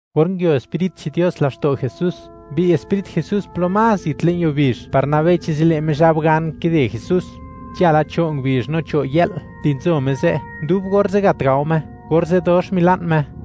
Or nguio Sprit che'n Dios laxto' Jesús, mbi'y Sprit Jesús plo más zit le'n yuo bizh par nabei chi zile' Mizhab gan kide Jesús. Nzhala cho' ngubizh no cho' yë'l di nzo Me ze', dub orze' gat gao Me, orze' dox mila'n Me.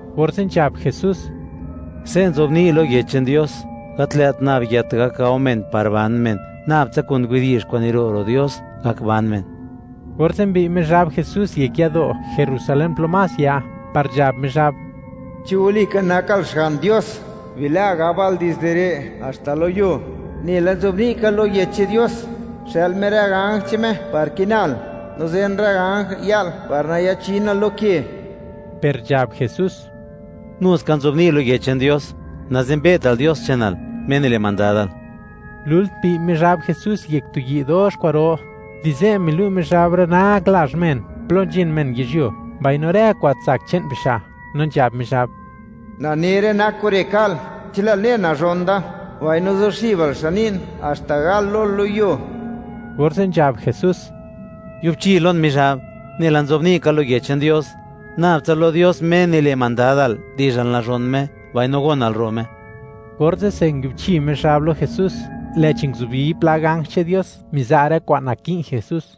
Orze' nzhab Jesús: ―Se' nzobni' lo Yech che'n Dios: “Gat lë't nab yët gak gao men par ban men; nab tsa kun widi'zh kwa'n niro' ro' Dios gak ban men.” Orze' mbi'y Mizhab Jesús yek yado' Jerusalén plo más ya, par nzhab Mizhab: ―Chi walika nakal Xga'n Dios, bila' gabal dizde re' haxta lo yuo; nela nzobni' ka lo Yech che'n Dios: “Xë'l Me rë ganj che'n Me par kinal, no zen rë ganj ya'l par nayachinal lo ke.” Per nzhab Jesús: ―Nuska nzobni' lo Yech che'n Dios: “Nazenbe'tal Dios che'nal, Me nile' mandadal.” Lult mbi'y Mizhab Jesús yek tu yi' dox kwa'ro; di ze' milu' Mizhab rë nak lazh men, plo nzhin men yizhyuo, mbaino rë kwa'n tsak che'n bixa', no nzhab Mizhab: ―Na ne rë nak kure' ka'l, chi lë'l ne, nazhon da, mbaino zuxibal xan ni'n haxta gal lol lo yuo. Orze' nzhab Jesús: ―¡Yubchi lon, Mizhab! Nela nzobni' ka lo Yech che'n Dios: “Nabtsa lo Dios, Me nile' mandadal, di'zhal nazhon Me, mbaino gonal ro' Me.” Orze'se nguiubchi Mizhab lo Jesús, lë'chi nguzubi pla ganj che'n Dios, miza' rë kwa'n naki'n Jesús.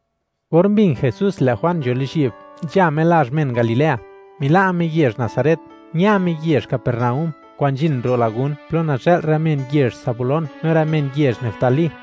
Or mbin Jesús, lë' Juan nzho lizhyi'b, nzha Me lazh men Galilea. Mila' Me yezh Nazaret, ña Me yezh Capernaúm, kwa'n nzhin ro' lagún plo nazhë'l rë men yezh Zabulón no rë men yezh Neftalí,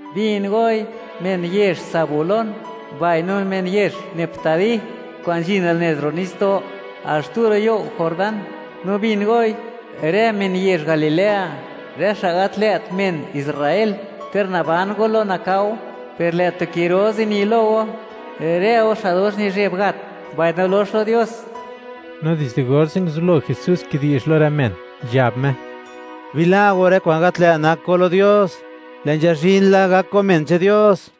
Bin goi, men yezh Zabulón, mbaino men yezh Neftalí, kwa'n nzhin al nez ro' nitsdo' al xtu ro' you' Jordán; no bin goi, rë men yezh Galilea, rë xa' gat lë't men Israel: Ter naban go lo nakao, per lë' tu ki ro zini lo go; rë go xa' dox nizheb gat mbaino lox lo Dios. No dizde orze' nguzublo kidi'zh Jesús lo rë men, nzhab Me: ―Bila' go rë kwa'n gat lë' nak go lo Dios; lë' nzhazhin la gak go men che'n Dios.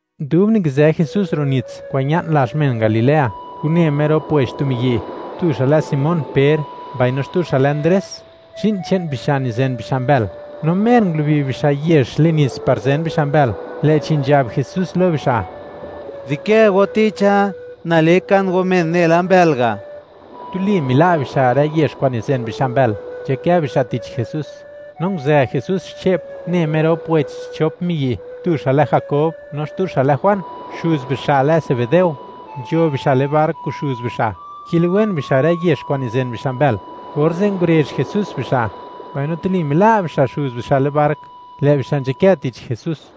Dub nikizë Jesús ro' nits kwa'n ña'n lazh men Galilea, une Me rop wech tu miyi'. Tu xa' lë Simón Per, mbaino xtu xa' lë Ndres. Zhi'n che'n bixa' nizen bixa' mbël, no mer ngulubi bixa' yex le'n nits par zen bixa' mbël, lë'chi nzhab Jesús lo bixa': ―Dikë go ticha, na le kan go men nela mbël ga'. Tuli mila' bixa' rë yex kwa'n nizen bixa' mbël, nzhakë bixa' tich Jesús. No nguzë Jesús xche'p, une Me rop wech xchop miyi', tu xa' lë Jakob no xtu xa' lë Juan, xuz bixa' lë Zebedeo; nzho bixa' le'n bark kun xuz bixa', kiliwen bixa' rë yex kwa'n nizen bixa' mbël. Orze' ngurezh Jesús bixa'. Mbaino tuli mila' bixa' xuz bixa' le'n bark, lë' bixa' nzhakë tich Jesús.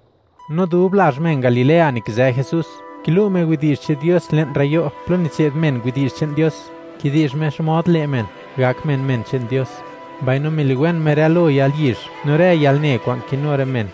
No dub lazh men Galilea, nikizë Jesús, kilu' Me widi'zh che'n Dios le'n rë yo' plo nitse'd men widi'zh che'n Dios, kidi'zh Me xmod le' men, gak men, men che'n Dios; mbaino miliwen Me rë lo yalyizh no rë yalne kwa'n kinu rë men.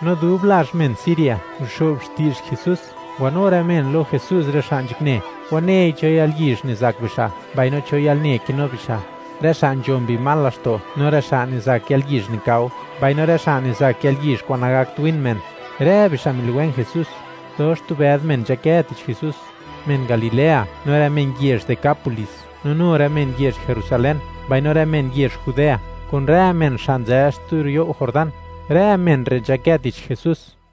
No dub lazh men Siria nguxo'b xti'zh Jesús, ngwanu rë men lo Jesús rë xa' nzhakne, wanei cho yalyizh nizak bixa', mbaino cho yalne kinu bixa'; rë xa' nzho mbi mal laxto' no rë xa' nizak yalyizh nikao, mbaino rë xa' nizak yalyizh kwa'n nagakt win men; rë bixa' miliwen Jesús. Dox tu bëd men nzhakë tich Jesús: men Galilea no rë men yezh Decápolis, no nu rë men yezh Jerusalén, mbaino rë men yezh Judea, kun rë men xa' nzë xtu ro' you' Jordán; rë men re' nzhakë tich Jesús.